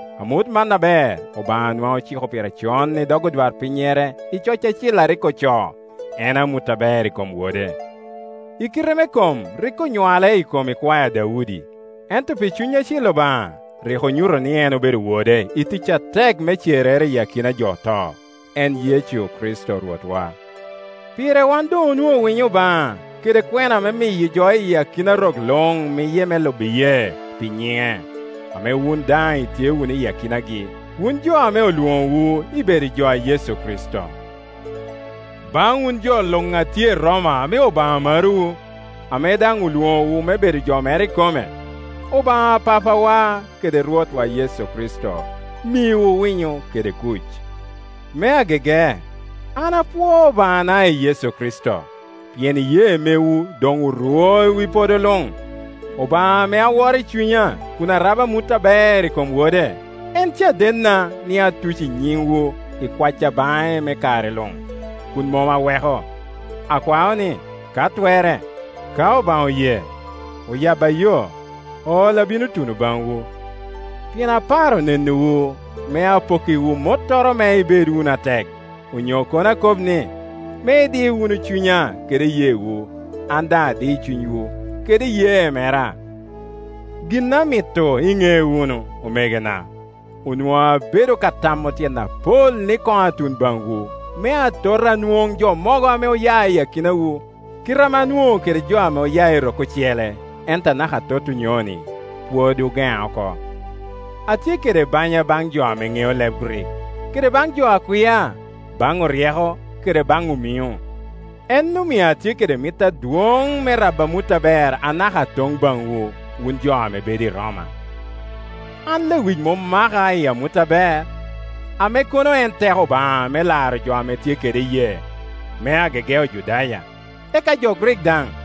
Amut man aber Obaŋa nwaŋ ociko pire con i dog odwarpinnyere i coc acil a rik ocoo, en amut aber i kom Wode. I kite me kom rik onywale i kom ikwae a Daudi, ento pi Cuny Acil Obaŋa rik onyuto ni en obedo Wode i tic atek me cerrere iyi akina a jo oto, en Yecu Kricito Rwotwa. Pire wan doŋ onwoŋo winyo Obaŋa, kede kwena me miyo jo i akina rok luŋ miye me lubo iyee, pi nyiŋe; ame wun daŋ itye wunu i akinagi, wun jo ame olwoŋowu ibedo jo a Yecu Kricito. Baŋ wun jo luŋ a tye i Roma ame Obaŋa marowu, ame daŋ olwoŋowu me bedo jo mere ikome: Obaŋa Papawa kede Rwotwa Yecu Kricito miwu winyo kede kuc. Me agege, an apwoo Obaŋana i Yecu Kricito, pien iyee mewu doŋ orwo i wi podo luŋ. Obaŋa ame aworo i cunya kun arabo amut aber i kom Wode, en cadenna ni atuco nyiŋwu i kwacca baŋe me kare luŋ, kun mom aweko. Akwao ni, ka twerre, ka Obaŋa oye, oyabba yo, ol abino tuno baŋwu. Pien aparo nenowu, me apokkiwu mottoro me ibed wunu atek; onyo kono akob ni, me idi wunu cunya kede iyeewu, an daŋ adi cunywu kede iyee mera. Gin amito iŋe wunu, omegona, onwoŋo abedo ka tamo tyen apol ni koŋ atun baŋwu, me atot anwoŋ jo mogo ame oya i akinawu, kite ame anwoŋo kede jo ame oya i rok ocele, ento anaka atot onyoni pwod ogeŋa oko. Atye kede banya baŋ jo aŋeo leb Grik, kede baŋ jo a kwia, baŋ oryeko kede baŋ omiŋo; en omio atye kede mit adwoŋ me rabo amut aber anaka atoŋ baŋwu, wun jo a bedo i Roma. An lewic mom maka i amut aber, ame kono en teko Obaŋa me laro jo a tye kede iyee, me agege Ojudaya, eka jo Grik daŋ.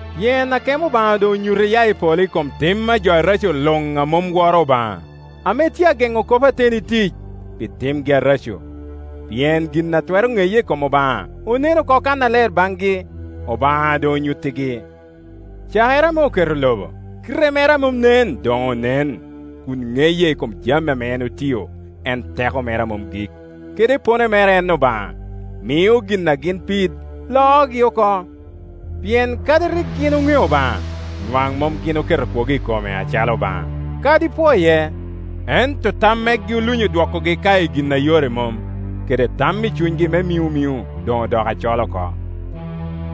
Pien akemo Obaŋa doŋ onyuto iya i polo i kom tim a jo areco luŋ a mom woro Obaŋa, ame tye a geŋo kop ateni i tic, pi timgi areco. Pien gin a twero ŋeye i kom Obaŋa onen oko kannaler baŋgi, Obaŋa doŋ onyuttigi. Cakere ame oketo lobo, kite mere a mom nen doŋ onen, kun ŋeye i kom jami a en otio, en teko mere a mom gik, kede epone mere en Obaŋa. Mio gin a gin pid loogi oko; pien kadi rik gin oŋeo Obaŋa, nwaŋ mom gin oketo kwogo i kome acalo Obaŋa, kadi pwoye, ento tam megi olunyo dwokogi ka i gin a yore mom, kede tam i cunygi me miŋomiŋo doŋ odoko acol oko.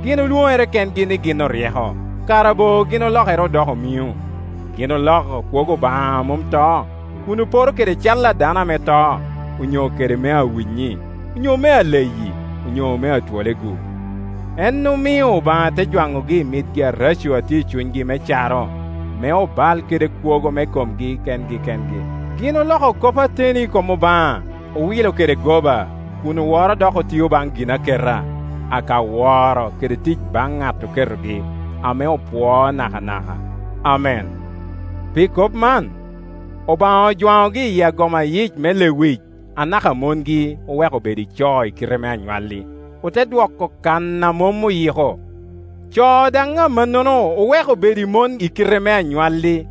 Gin olwoŋere kengi ni gin oryeko, kara bo gin olokere odoko omiŋo. Gin oloko kwogo Obaŋa a mom to, kun oporo kede cal a dano ame to, onyo kede mea winyi, onyo mea leyi, onyo mea twole-gu. En omio Obaŋa te jwaŋogi i mit areco a tye i cunygi me caro, me obal kede kwogo me komgi kengi kengi. Gin oloko kop ateni i kom Obaŋa, owilo kede goba, kun oworo dok otio baŋ ginaketa, aka woro kede tic baŋ ŋat oketogi, ame opwoo nakanaka. Amen. Pi kop man, Obaŋa ojwaŋogi i agoma yie me lewic. Anaka mongi oweko bedo i co i kite me anywalli, ote dwoko kan a mom oyiko. Co daŋ amannono oweko bedo i mon i kite me anywalli,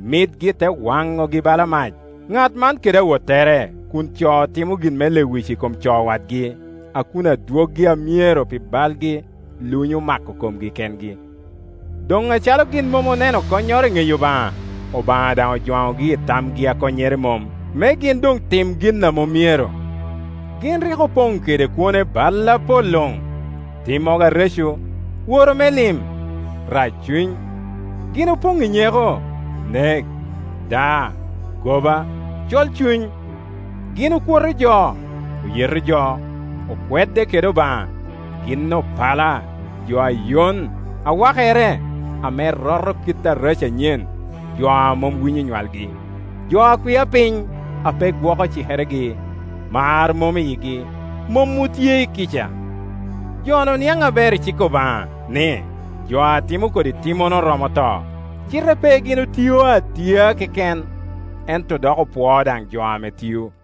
mitgi te waŋogi bala mac, ŋat man kede awottere, kun co timo gin me lewic i kom co wadgi, a kun adwoggi a myero pi balgi lunyo mako komgi kengi. Doŋ acalo gin mom oneno konnyoro i ŋeyo Obaŋa, Obaŋa daŋ ojwaŋogi i tamgi a konnyere mom, me gin doŋ tim gin a mom myero. Gin rik opoŋ kede kwone bal apol luŋ, timmogo areco, woro me lim, rac cuny. Gin opoŋ i nyeko, nek, daa, goba, colcuny. Gin okwoto jo, oyeto jo, okwedde kede Obaŋa. Gin opala, jo a yon, a wakere, ame roto kit areco anyen, jo a mom winyo onywalgi, jo a kwia piny, ape gwoko cikeregi; mar mom i yigi, mom otye i kica. Jo-nu niaŋ aber i cik Obaŋa, ni, jo a timo kodi timmono romo to, cite pe gin otio atia keken, ento dok opwoo daŋ jo ame tio.